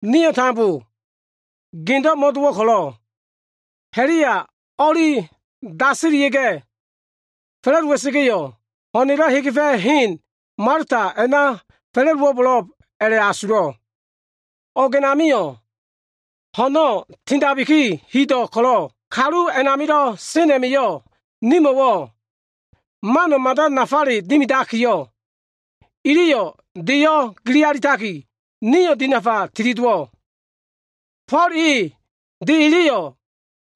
Nio꞉ tambo gendo꞉ mo꞉dowo꞉ ko꞉lo꞉ ha꞉la꞉ya o꞉li daselia꞉ga꞉ fa꞉la꞉dowa꞉sa꞉ga꞉yo꞉, ho꞉na꞉lo꞉ hegefa꞉ hen Malta a꞉na fa꞉la꞉dowo꞉bo꞉lo꞉b a꞉la꞉asulo꞉. O꞉g a꞉namio꞉ ho꞉no꞉ tindaki hido꞉wo꞉ dowo꞉ ko꞉lo꞉, kalu a꞉namilo꞉ sen a꞉ma꞉yo꞉, nimo꞉wo꞉ mano꞉ mada nafale dimidakiyo꞉, iliyo꞉ deyo꞉ gili alitaki, nio꞉ dinafa tili dowo꞉. Fo꞉l e de eleyo꞉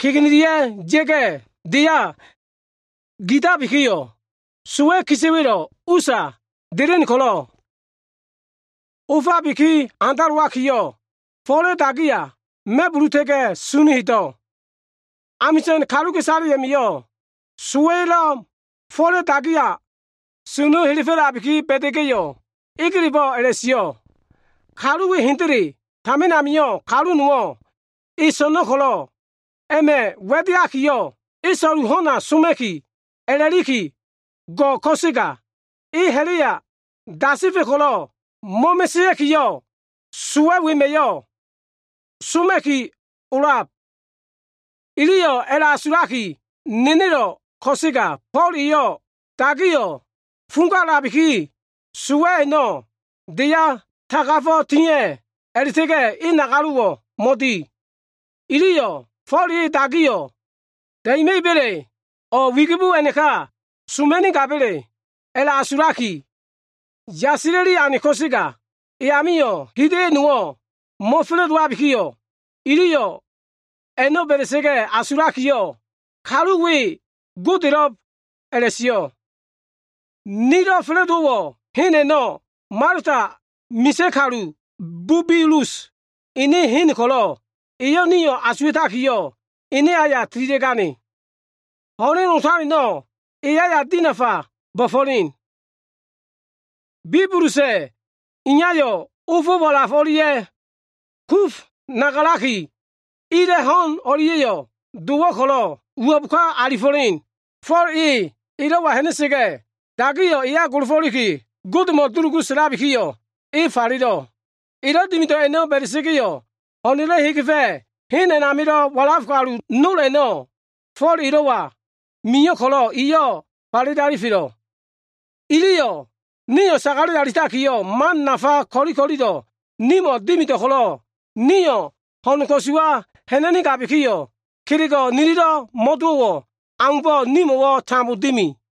kegenelia꞉ ya꞉ga꞉ deya dia꞉tabikiyo꞉, sowa꞉ kisa꞉wa꞉lo꞉ usa delen ko꞉lo꞉, ofabiki handalowakiyo꞉, Fo꞉la꞉ dagiya ma꞉buluta꞉ga꞉ sunu hedo꞉. Amisa꞉n kaluka꞉isale a꞉ma꞉yo꞉ sowa꞉yo꞉ Fo꞉la꞉ dagiya sunu helefo꞉labiki ba꞉da꞉ga꞉yo꞉, egelebo꞉ a꞉la꞉sio꞉, “Kalu we hendele tamin amio꞉ kalu nowo꞉ e so꞉no꞉ ko꞉lo꞉ a꞉ma꞉ wa꞉l diakiyo꞉, e so꞉lu ho꞉na soma꞉ki a꞉la꞉liki go꞉ ko꞉sega e ha꞉la꞉ya dasefa꞉ ko꞉lo꞉ mo꞉mesea꞉kiyo꞉, sowa꞉ wema꞉yo꞉ e soma꞉ki o꞉lab.” Iliyo꞉ a꞉la꞉asulaki nenelo꞉ ko꞉sega, Fo꞉l eyo꞉ dagiyo꞉ fugala꞉labiki, sowa꞉ a꞉no꞉ deya tagafo꞉ tia꞉ a꞉la꞉ta꞉ga꞉ e nagalo꞉wo꞉ mo꞉di. Iliyo꞉ Fo꞉l e dagiyo꞉ da꞉ima꞉iba꞉le, o꞉ e wigibo a꞉naka soma꞉nigabele a꞉la꞉asula꞉liki yasila꞉li ane ko꞉sega, e amio꞉ hida꞉yo꞉ nowo꞉ mo꞉fa꞉la꞉dowabikiyo꞉, iliyo꞉ a꞉no꞉ ba꞉da꞉sa꞉ga꞉ a꞉asulakiyo꞉, kalu we godelo꞉b a꞉la꞉sio꞉. Nilo꞉ fa꞉la꞉dowo꞉ hen a꞉no꞉ Malta misa꞉ kalu Bubilus ene hen ko꞉lo꞉ eyo꞉ nio꞉ asuwa꞉takiyo꞉, ene aya tililia꞉ga꞉, ho꞉len otaleno꞉ eyo꞉ nio꞉ dinafa bo꞉fo꞉len. Bubilusa꞉ iyayo꞉ ofo꞉ walaf o꞉lia꞉ kuf nagalaki, ila꞉ ho꞉n o꞉lia꞉yo꞉ dowo꞉ ko꞉lo꞉ uwo꞉b ka alifo꞉len. Fo꞉lo꞉ elo꞉wa ha꞉na꞉sa꞉ga꞉, dagiyo꞉ eya golofo꞉liki, Godemo꞉ dulugu sa꞉labikiyo꞉, e falelo꞉. Elo꞉ dimido꞉ a꞉no꞉ ba꞉da꞉sa꞉ga꞉yo꞉, ho꞉na꞉lo꞉ hegefa꞉ hen a꞉namilo꞉ walaf kalu sen nol a꞉no꞉, Fo꞉l elo꞉wa mio꞉ ko꞉lo꞉, iyo꞉ falele alifelo꞉. Iliyo꞉ nio꞉ sagale alitaki, man nafale ko꞉li ko꞉lilo꞉ nimo꞉ dimido꞉ ko꞉lo꞉, nio꞉ ho꞉n ko꞉suwa ha꞉na꞉nigabikiyo꞉, kelego꞉ nililo꞉ mo꞉dowo꞉ aumbo꞉, nimo꞉wo꞉ tambo dimi.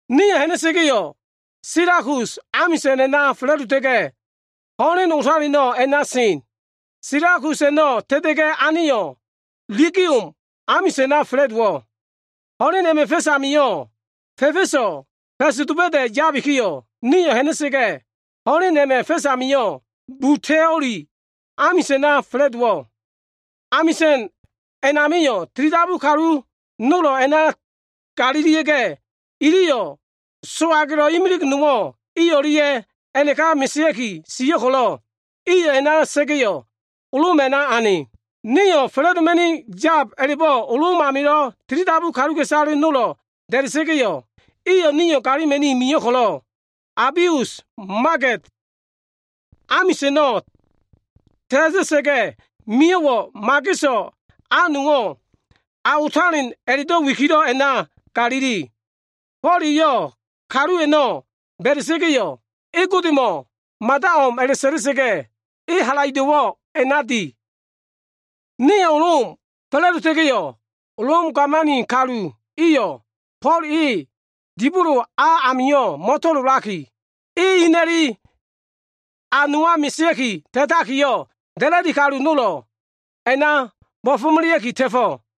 Nio꞉ ha꞉na꞉sa꞉ga꞉yo꞉, Silakus amisa꞉n a꞉na fa꞉la꞉dota꞉ga꞉, ho꞉len otaleno꞉ a꞉na sen. Silakus a꞉no꞉ ta꞉ta꞉ga꞉ aneyo꞉, Legium amisa꞉na fa꞉la꞉dowo꞉. Ho꞉len a꞉ma꞉ fa꞉s amio꞉, fa꞉fa꞉so꞉ fa꞉s doba꞉da꞉ yabikiyo꞉ nio꞉ ha꞉na꞉sa꞉ga꞉, ho꞉len a꞉ma꞉ fa꞉s amio꞉ Buteoli amisa꞉na fa꞉la꞉dowo꞉. Amisa꞉n a꞉namio꞉, tilidabu kalu nolo꞉ a꞉na galilia꞉ga꞉, iliyo꞉ so꞉agelo꞉ imilig nowo꞉ i o꞉lia꞉ a꞉naka mesea꞉ki sio꞉ ko꞉lo꞉, iyo꞉ a꞉na sa꞉ga꞉yo꞉, Lom a꞉na ane. Nio꞉ fa꞉la꞉doma꞉ni yab a꞉la꞉bo꞉ Lom amilo꞉ tilidabu kaluka꞉isale nolo꞉ da꞉da꞉sa꞉ga꞉yo꞉, iyo꞉ nio꞉ galima꞉ni mio꞉ ko꞉lo꞉, Abius Magede amisa꞉no꞉ ta꞉ta꞉sa꞉ga꞉ mio꞉wo꞉, mageso꞉ a nowo꞉ A Otalen a꞉la꞉do꞉ wikilo꞉ a꞉na galili. Fo꞉l eyo꞉ kalu a꞉no꞉ ba꞉da꞉sa꞉ga꞉yo꞉, e Godemo꞉ mada o꞉m a꞉la꞉sa꞉la꞉sa꞉ga꞉yo꞉, e halaido꞉wo꞉ a꞉na di. Nio꞉ Lom fa꞉la꞉dota꞉ga꞉yo꞉, Lom gamani kalu iyo꞉ Fo꞉l e dibolo a amio꞉ mo꞉to꞉lolaki, e ina꞉li a nowa mesea꞉ki ta꞉takiyo꞉, da꞉la꞉di kalu nolo꞉ a꞉na bo꞉fo꞉melea꞉ki ta꞉fo꞉.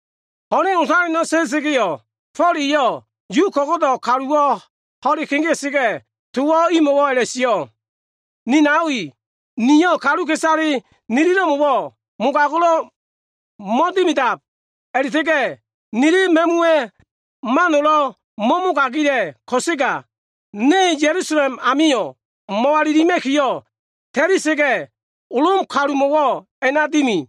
Ho꞉len otaleno꞉ ta꞉ta꞉sa꞉ga꞉yo꞉, Fo꞉l eyo꞉ Yu ko꞉go꞉do꞉ kaluwo꞉ ho꞉le kegea꞉sa꞉ga꞉, towo꞉ imo꞉wo꞉ a꞉la꞉sio꞉, “Ni nao i, niyo꞉ kaluka꞉isale nililo꞉mo꞉wo꞉ mogago꞉lo꞉ mo꞉dimida꞉b a꞉la꞉ta꞉ga꞉ nili ma꞉muwa꞉ mano꞉lo꞉ mo꞉mogagila꞉ ko꞉sega, ne Ya꞉lusalem amio꞉ mo꞉walilima꞉kiyo꞉ ta꞉lia꞉sa꞉ga꞉, Lom kalumo꞉wo꞉ a꞉na dimi.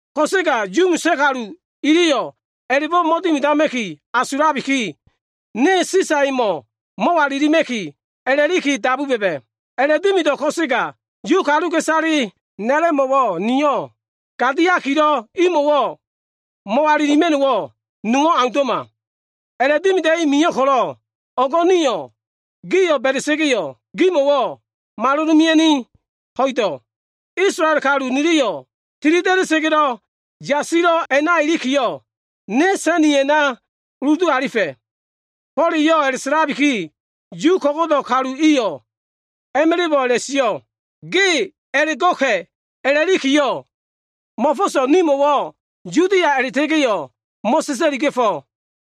Ko꞉sega Yu misa꞉ kalu iliyo꞉ a꞉la꞉bo꞉ mo꞉dimidama꞉ki asulabiki, ne Sisa emo꞉ mo꞉walilima꞉ki a꞉la꞉liki dabu ba꞉ba꞉. A꞉la꞉dimido꞉ ko꞉sega, Yu kaluka꞉isale na꞉lo꞉mo꞉wo꞉ niyo꞉ gadiakiyo꞉ imo꞉wo꞉ mo꞉walilima꞉no꞉wo꞉ nowo꞉ aundo꞉ma. A꞉la꞉dimida꞉i mio꞉ ko꞉lo꞉, o꞉go꞉ niyo꞉ gio꞉ ba꞉da꞉sa꞉ga꞉yo꞉ gimo꞉wo꞉ malolomea꞉ni ho꞉ido꞉. Isolael kalu nililo꞉ tili da꞉da꞉sa꞉ga꞉lo꞉ yasilo꞉ a꞉na ilikiyo꞉, ne sa꞉niya꞉ a꞉na uludu alifa꞉.” Fo꞉l eyo꞉ a꞉la꞉sa꞉labiki, Yu ko꞉go꞉do꞉ kalu iliyo꞉ a꞉ma꞉la꞉bo꞉ a꞉la꞉sio꞉, “Ge a꞉la꞉go꞉ka꞉ a꞉la꞉likiyo꞉ mo꞉fo꞉so꞉ nimo꞉wo꞉ Yudia a꞉la꞉ta꞉ga꞉yo꞉ mo꞉sa꞉sa꞉liga꞉fo꞉.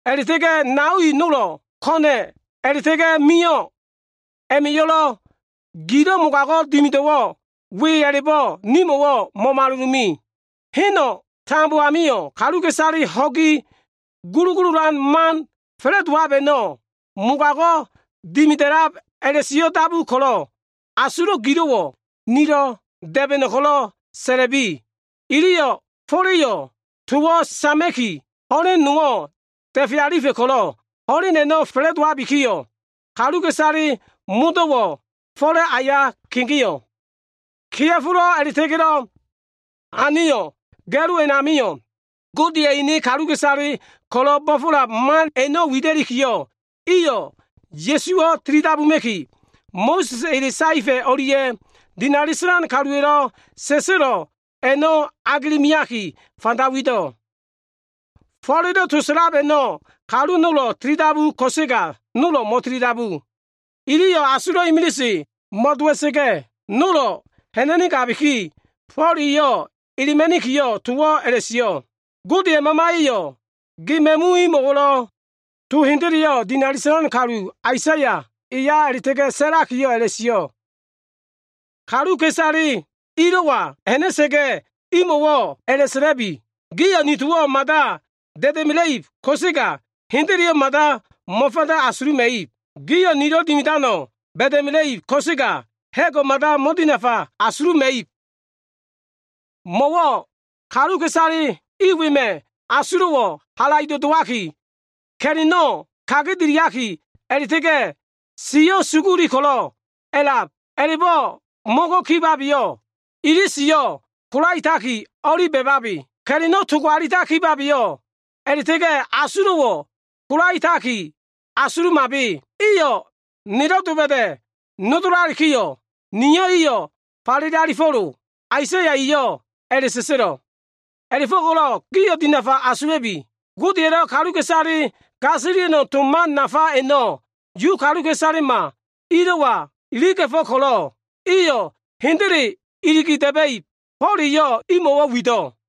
A꞉la꞉ta꞉ga꞉ nao i nolo꞉ ko꞉na꞉ a꞉la꞉ta꞉ga꞉ mio꞉ a꞉ma꞉yo꞉lo꞉ gilo꞉ mogago꞉ dimido꞉wo꞉ we a꞉la꞉bo꞉ nimo꞉wo꞉ mo꞉malolome. Heno꞉ tambo amio꞉ kaluka꞉isaleyo꞉ ho꞉gi gulugululan man fa꞉la꞉dowab a꞉no꞉ mogago꞉ dimida꞉lab a꞉la꞉sio꞉ dabu ko꞉lo꞉, asulo꞉ gilo꞉wo꞉ nio꞉lo꞉ da꞉ba꞉no꞉ ko꞉lo꞉ sa꞉la꞉bi.” Iliyo꞉ Fo꞉la꞉yo꞉ towo꞉ sama꞉kiyo꞉, ho꞉len nowo꞉ da꞉fe alifa꞉ ko꞉lo꞉, ho꞉len a꞉no꞉ fa꞉la꞉dowabikiyo꞉, kaluka꞉isale modo꞉wo꞉ Fo꞉la꞉ aya kegeo꞉. Kea꞉folo꞉ a꞉la꞉ta꞉ga꞉lo꞉ aneyo꞉ ga꞉lo a꞉namio꞉, Godeya꞉ ene kaluka꞉isale ko꞉lo꞉ bo꞉fo꞉lab man a꞉no꞉ widakiyo꞉, iyo꞉ Ya꞉suwo꞉ tilidabuma꞉ki, Mo꞉sa꞉sa꞉ ele saefa꞉ o꞉lia꞉ dinali sa꞉lan kaluwa꞉lo꞉ sa꞉sa꞉lo꞉ a꞉no꞉ agele meakiyo꞉, fanda wido꞉. Fo꞉la꞉lo꞉ to sa꞉lab a꞉no꞉ kalu nolo꞉ tilidabu ko꞉sega nolo꞉ mo꞉tilidabu. Iliyo꞉ asulo꞉wo꞉ imiliseyo꞉ mo꞉dowa꞉sa꞉ga꞉, nolo꞉ ha꞉na꞉nigabiki, Fo꞉l eyo꞉ elema꞉nikiyo꞉, towo꞉ a꞉la꞉sio꞉, “Godeya꞉ Mamaya꞉yo꞉ ge ma꞉mu imo꞉wo꞉ to hendeleyo꞉ dinali sa꞉lan kalu Aisaya eya a꞉la꞉ta꞉ga꞉ sa꞉lakiyo꞉ a꞉la꞉sio꞉, “ ‘Kaluka꞉isale ilo꞉wa ha꞉na꞉sa꞉ga꞉yo꞉, imo꞉wo꞉ a꞉la꞉sa꞉la꞉bi. Gio꞉ ni towo꞉ mada da꞉da꞉mela꞉ib ko꞉sega, hendeleyo꞉ mada mo꞉fanda asuluma꞉ib. Gio꞉ nilo꞉ dimidano꞉ ba꞉da꞉mela꞉ib ko꞉sega ha꞉go꞉ mada mo꞉dinafa asuluma꞉ib. Mo꞉wo꞉ kaluka꞉isale i wema꞉ asulo꞉wo꞉ ko꞉ndo꞉fe alitaki, ka꞉la꞉no꞉ kagedeliaki, a꞉la꞉ta꞉ga꞉ iliyo꞉ ini siyo꞉ suguli. A꞉la꞉bo꞉ mo꞉ngai kibabeyo꞉, ili siyo꞉ kolaetaliki o꞉li ba꞉babe, ka꞉la꞉no꞉ togo alitaliki o꞉li da꞉babe, a꞉la꞉ta꞉ga꞉ asulo꞉wo꞉ kolaetaliki o꞉li asulumabe. Iyo꞉ nelo꞉ doba꞉da꞉ nodolalikiyo꞉, Niyo꞉ iyo꞉ falele alifo꞉lo.’ Aisaya eyo꞉ a꞉la꞉sa꞉sa꞉lo꞉. “A꞉la꞉fo꞉ko꞉lo꞉ gio꞉ dinafa asula꞉bi. Godeya꞉lo꞉ kaluka꞉isalelo꞉ gasilia꞉no꞉ to man nafa a꞉no꞉ Yu kaluka꞉isalema ilo꞉wa iliga꞉fo꞉ ko꞉lo꞉, iyo꞉ hendele iligi da꞉ba꞉ib.” Fo꞉l eyo꞉ imo꞉wo꞉ wido꞉.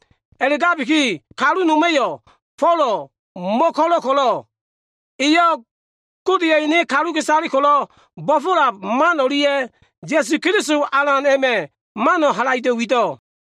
A꞉la꞉gabiki, kalu noma꞉yo꞉ Folo꞉ mo꞉ko꞉lo꞉ ko꞉lo꞉, eyo꞉ Godeya꞉ ene kaluka꞉isale ko꞉lo꞉ bo꞉fo꞉lab man o꞉lia꞉, Ya꞉su Keliso Alan a꞉ma꞉ mano꞉ halaido꞉ wido꞉.